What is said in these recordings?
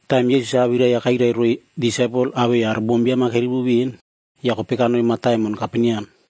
Taim Yesus-a awirai-ya kairai roiy disaipel awei aro bombiam-a kerivo ven ya kopei kanoi mataimon Kaperneam.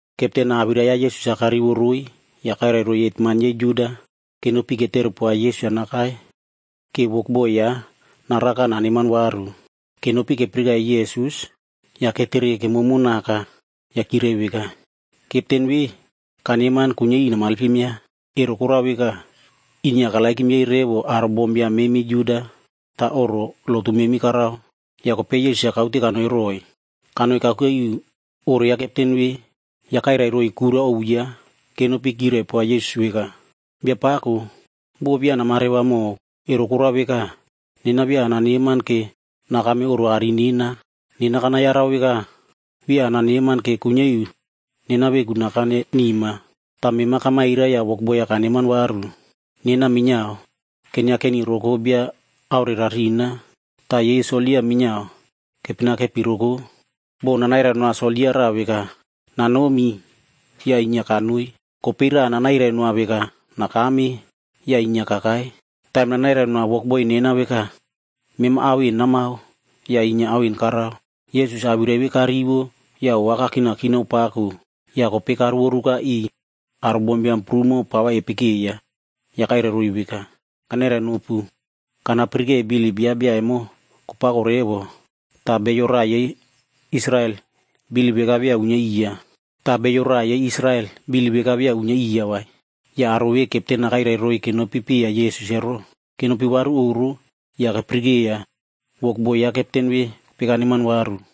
Kepten-a awirai ya Yesus-a karivo roiy ya kairai roiy hetman yei Juda nenopi netere poa Yesus-a nakai ke wokboi yaꞌa naraka naneman varu. Kenopi kepirikeiya Yesus, ya ketere kemomo naka ya kyirai veka, “Kepten ve kaneman kuinyia iu namalpim yaꞌa, ero korao veka, inyia karereroiy revo aro bombiam memi Juda ta oꞌro lotu memi karao.” Ya kopei Yesus-a kaute kanoi roiy. Kanoi kakuke iu oꞌro ya kepten ve, ya kairai roiy kura ovu yaꞌa kenopi kyirai poa Yesus veka, “Biapako, bo via namareva mow, ero korao veka, nena via ananeman ke nakame oꞌro aꞌari nena. Nena kanayarau veka via ananeman ke kuinyia iu nena veku nakane nima. Ta mema kamairai ya wokboi-ya kaneman varu. Nena minyiao kenyiakeni roko bia aorerarina. Ta yei soldia minyiao kepenakepi roko. Bo nanairai noa soldia raꞌa veka, ‘Nanomi,’ ya inyia kanoi. Kopei raꞌa nanairai noa veka, ‘Nakame,’ ya inyia kakai. Taim nanairai noa wokboi nena veka, ‘Mema ao en namao,’ ya inyia ao en karao.” Yesus-a awirai ve karivo ya ova kakinakinao pako, ya kopei karovoruka iꞌiy aro bombiam prumo pa va epekeiya ya kairai roiy veka, “Kanairai nopu, kanapirike bilip yaꞌa bia emo kopako revo, ta bio raꞌa yei Israel bilip veka via uinyia iya vai.” Ya aro ve kepten-a kairai roiy kenopi piya Yesus ero, kenopi varu oꞌro ya kepirikeiya wokboi ya kepten ve kopei kaneman varu.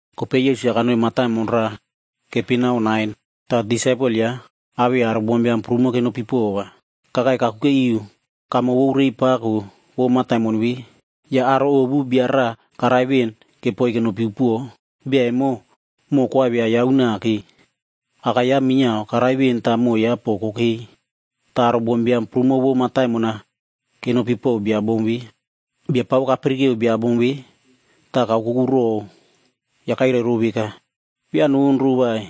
Kopei Yesus-a kanoi mataimon raꞌa keipinao Nain, ta disaipel yaꞌa awei aro bombiam prumo kenopi pova. Kakai kakuke iu kamo vou reiy pako vou mataimon ve, ya aro ovu bia raꞌa karai ven kepoiy kenopi upuo. Bia emo, moꞌo koaivia yaꞌa unake. Aka yaꞌa minyiao karai ven ta moꞌo yaꞌa po kokei. Ta aro bombiam prumo vou mataimon-a kenopi pow bia bom ve. Biapako kapirikeo bia bom ve, ta kaokoku row ya kairai row veka, “Via nonro vai.”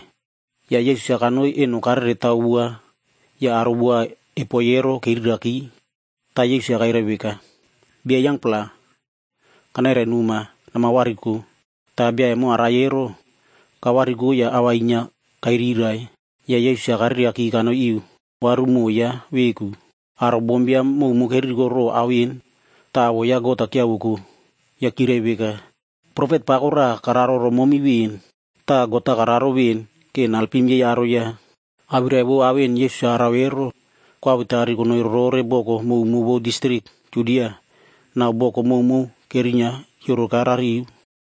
Ya Yesus-a kanoi eno kareretao wua ya aro wua epoi ero keriraki. Ta Yesus-a kairai veka, “Bia yangpla, kanairai noma, namavariko!” Ta bia emo arai ero, kavariko ya a va inyia kairirai. Ya Yesus-a karereaki kanoi iu varu moꞌo yaꞌa veku. Aro bombiam mowmow keririko row ao en ta awoꞌo ya God-a kyiavoko. Ya kyirai veka, “Profet pako raꞌa kararo romomi ven,” ta “God-a kararo ven ke naelpim yei aro yaꞌa.” Awirai vou ao en Yesus-a arao ero, koawetari konoi rorore boko mowmow vou distrik Judia nau boko mowmow kerinyia kyioroka rariu.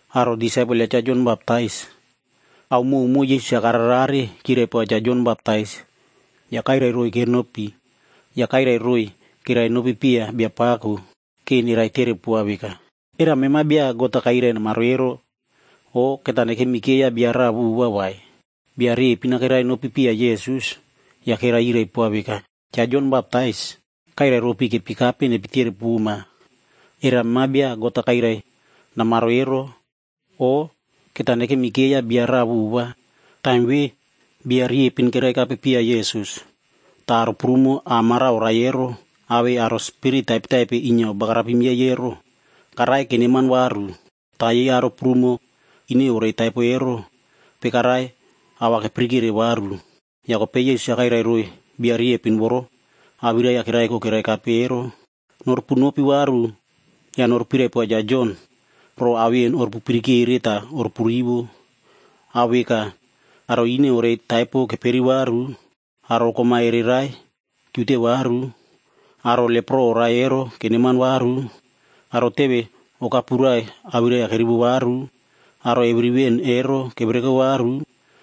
Aro disaipel ya Cha Jon Baptais,a ao mowmow ve Yesus-a kararerare kyirai poa Cha Jon Baptais ya kairiy riepin yei kekape piya. Ya kairai roiy kerainopi piya Biapako ke neraitere poa veka, “Era mema bia God-a kairai namaro ero, o keta nekemikeiya bia raꞌa vova vai?” Bia riepin-a kerainopi piya Yesus, ya kerai yirai poa veka, “Cha Jon Baptais kairai ropi kepikape nepitere poma, ‘Era mema bia God-a kairai namaro ero, o keta nekemikeiya bia raꞌa vova?’” Taim ve bia riepin keraikape piya Yesus, ta aro prumo a mara oraie ero awei aro spirit taipetaipe inyia obagarapim yei ero, karaie keneman varu. Ta yei aro prumo ine orei taipo ero kopei karaie ao va kepirikere varu. Ya kopei Yesus-a kairai roiy bia riepin voro awirai-ya keraiko keraikape ero, “Norupunopi varu ya norupirai poa Cha Jon row ao en orupu pirikere ta orupu rivo. Ao veka: aro ine orei taipo keperi varu, aro kom-a ereirai kyiute varu, aro lepro oraie ero keneman varu, aro teve okapurai awirai-ya kerivo varu, aro eviri ven ero kevereko varu,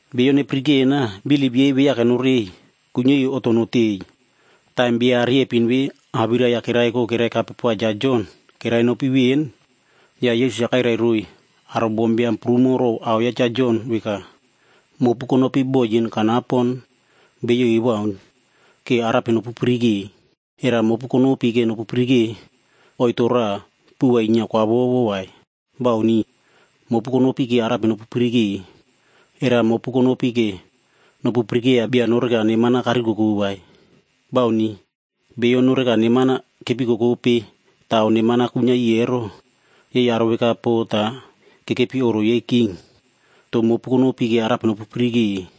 Beiyo nepirikena, bilip yei viake norei, kuinyia iu oꞌto notei.” Taim bia riepin ve awirai-ya keraiko keraikape poa Cha Jon kerainopi ven, ya Yesus-a kairai roiy aro bombiam prumo row ao ya Cha Jon veka, “Mopu konopi bo yin kanapon beiyo ewaun ke arape nopupirike? Era mopu konopi ke oito raꞌa puꞌu va inyia kwavovo nopupirike vai? Bauni. Mopu konopi ke arape nopupirike? Era mopu konopi ke nopu pirikeiya bia no neman neman-a karikoko vai? Bauni. Beiyo inyia no neman-a kepikokope ta ao neman-a kuinyia iꞌiy ero, yei aro veka po ta kekepi oꞌro yei king. To mopu konopi ke arape nopupirike?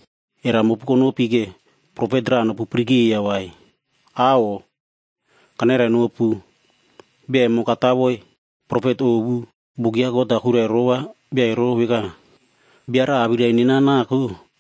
Era mopu konopi ke profet raꞌa nopu pirikeiya vai? Aꞌo! Kanairai nopu, bia emo katawoi profet ovu. Buk ya God-a kuirai rova bia ero veka, ‘Bia raꞌa awirai nena nako,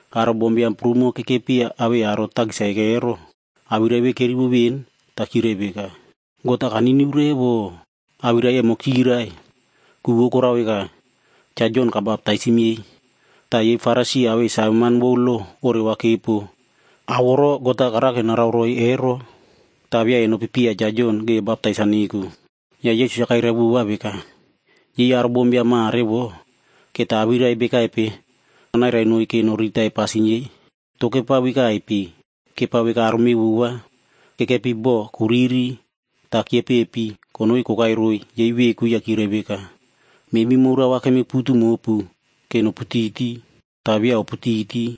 Aro bombiam prumo kekepi awei aro takis-a eko ero, awirai ve kerivo ven ta kyirai veka, “God-a kaniniu revo.” Awirai emo kyirai, ku vou korao veka, Cha Jon kabaptaisim yei. Ta yei Farisi awei saveman vou lo oreva kepo ao voro God-a karake narao roiy ero, ta via enopi piya Cha Jon ke baptais-a neko. Ya Yesus-a kairai vova veka, “Yei aro bombiam mare vo, keta awirai bekaipe nanairai noiy ke noriritai pasin yei? To kepao vekaipe? Kepao veka aro mevova kekepi bo kuriri ta kyepepi konoi kokai roiy yei veku ya kyirai veka, ‘Memi moura va kemiputu mopu ke noputiti ta via oputiti,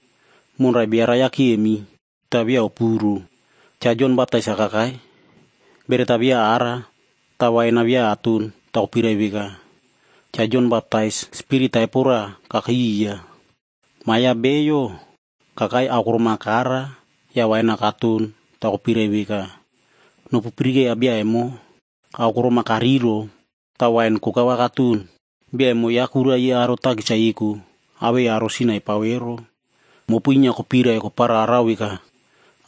monrai bio rai-ya kyemi, ta via opuro.’ “Cha Jon Baptais-a kakai, beret-a via ara ta wain-a via aton ta kopirai veka, ‘Cha Jon Baptais, spirit taipo raꞌa kakei iya.’ Ma ya Bio kakai aokorom-a kara ya wain-a katon ta kopirai veka, ‘Nopu pirikeiya bia emo, aokorom-a karirow ta wain koka va katon. Bia emo yaꞌa kura yei aro inyia takis-a eko awei aro yei sin-a epao ero.’ Mopu inyia kopirai kopararao veka,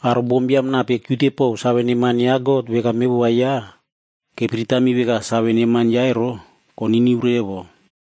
aro bombiam nape kyiute pow save neman ya God veka mevova yaꞌa, kepiritami veka save neman yaꞌa ero, koniniu revo.”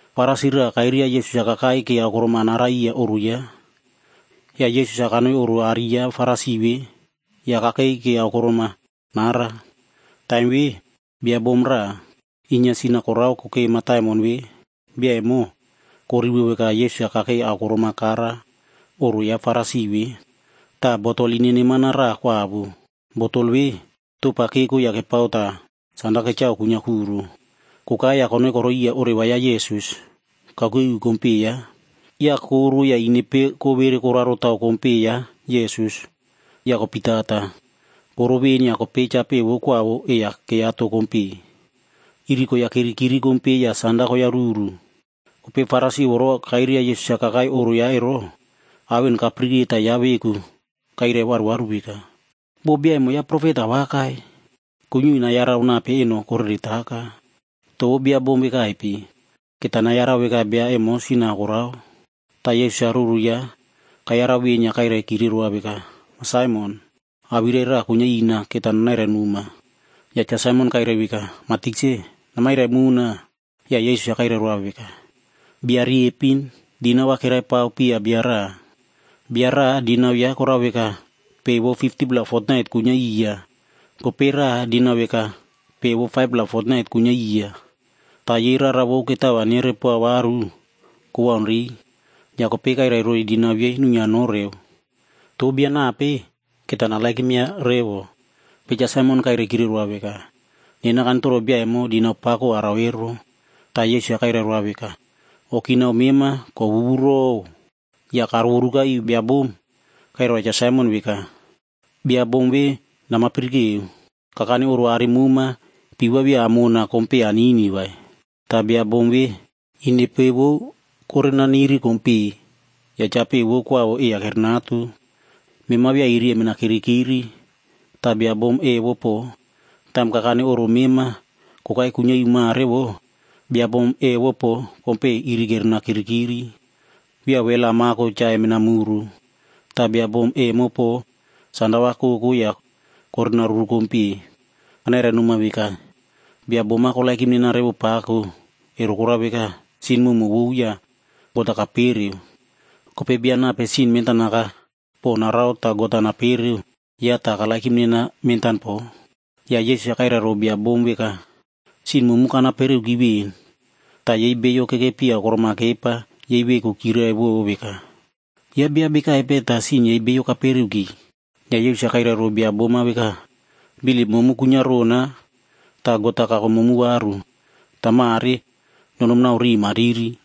Farisi raꞌa kairia Yesus-a kakai ke aokorom-a nara iya oꞌro yaꞌa. Ya Yesus-a kanoi oꞌro aꞌari ya Farisi ve ya kakeiyo ke aokorom-a nara. Taim ve, bia bom raꞌa inyia sin-a korao kokei mataimon ve. Bia emo korivo veka Yesus-a kakei aokorom-a kara oꞌro ya Farisi ve. Ta botol ine neman-a raꞌa kwavo. Botol ve topa keko ya kepao ta sanda kechao kuinyia kuro. Kokai ya konoi koroi iya oreva ya Yesus kakuke iu kompeꞌe yaꞌa, ya koro ya inepe kowere koraro tao kompeꞌe ya Yesus ya kopitata. Koro ven ya kopei chapeꞌe vou kwavo ei-ya keiyato kompeꞌe Yesus. Iri koyakirikiri kompeꞌe ya Yesus ya sanda koyaruru. Kopei Farisi voro kairia Yesus-a kakai oꞌro yaꞌa ero, ao en kapirike ta yaꞌa veku kairai varuvaru veka, “Bo bia emo yaꞌa profet awakai, kuinyia iu nayarau nape eno koreretaka. To vou bia bom vekaipe. Keta nayarau veka bia emo sin-a korao.” Ta Yesus-a ruru yaꞌa kayarau ven ya kairaikire roa veka, “Ma Saimon, awirai raꞌa kuinyia ina keta nanairai noma.” Ya Cha Saimon kairai veka, “Ma Tikse, namairai mona.” Ya Yesus-a kairai roa veka, “Bia riepin dinau va keraipao piya bia raꞌa. Bia raꞌa dinau ya korao veka pe vou 50-pla fotnait kuinyia iya, kopei raꞌa dinau veka pe vou 5-pla fotnait kuinyia iya. Ta yei rara vou ketao va nerepoa varu kowaunrei. Ya kopei kairai roiy dinau yei nuinyia noreu. To bia nape keta narererova revo?” Kopei Cha Saimon kairaikire roa veka, “Nena kanitoro bia emo dinau pako arao ero.” Ta Yesus-a kairai roa veka, “O kinao mema kowuwurow.” Ya karovoruka iu bia bom ya kairai roa Cha Saimon veka, “Bia bom ve namapirikeo? Kakane oꞌro aꞌari moma, pii va via amona ke kompeꞌe nanini vai, ta bia bom ve inepe vou korenaniri kompeꞌe ya chapeꞌe vou kwavo ei-ya kerenato kompe. Mema via iri emina kirikiri, ta bia bom evo po, taim kakane oꞌro mema kokai kuinyia iu mare vo, bia bom evo po kompeꞌe iri kerena kirikiri. Via wel-a amako cha emena muru, ta bia bom emo po sanda va koko ya korena ruru kompe. Kanairai noma veka, bia bom-a korererona revo pako, ero korao veka, sin mowmow vou ya God-a kapereoki. Kopei bia nape sin mentanaka po narao ta God-a napereo, yaꞌa ta karererona mentan po.” Ya Yesus-a kairai row bia bom veka, “Sin momu kanapereoki ven.” Ta yei beiyo kekepi aokorom-a kepa yei veku kyirirai veka, “Yaꞌa bia bekaipe ta sin yei beiyo kapereoki?” Ya Yesus-a kairai row bia bom-a veka, “Bilip momu kuinyia rona ta God-a kako momu varu. Ta mare nonomi nau riꞌi mariri.”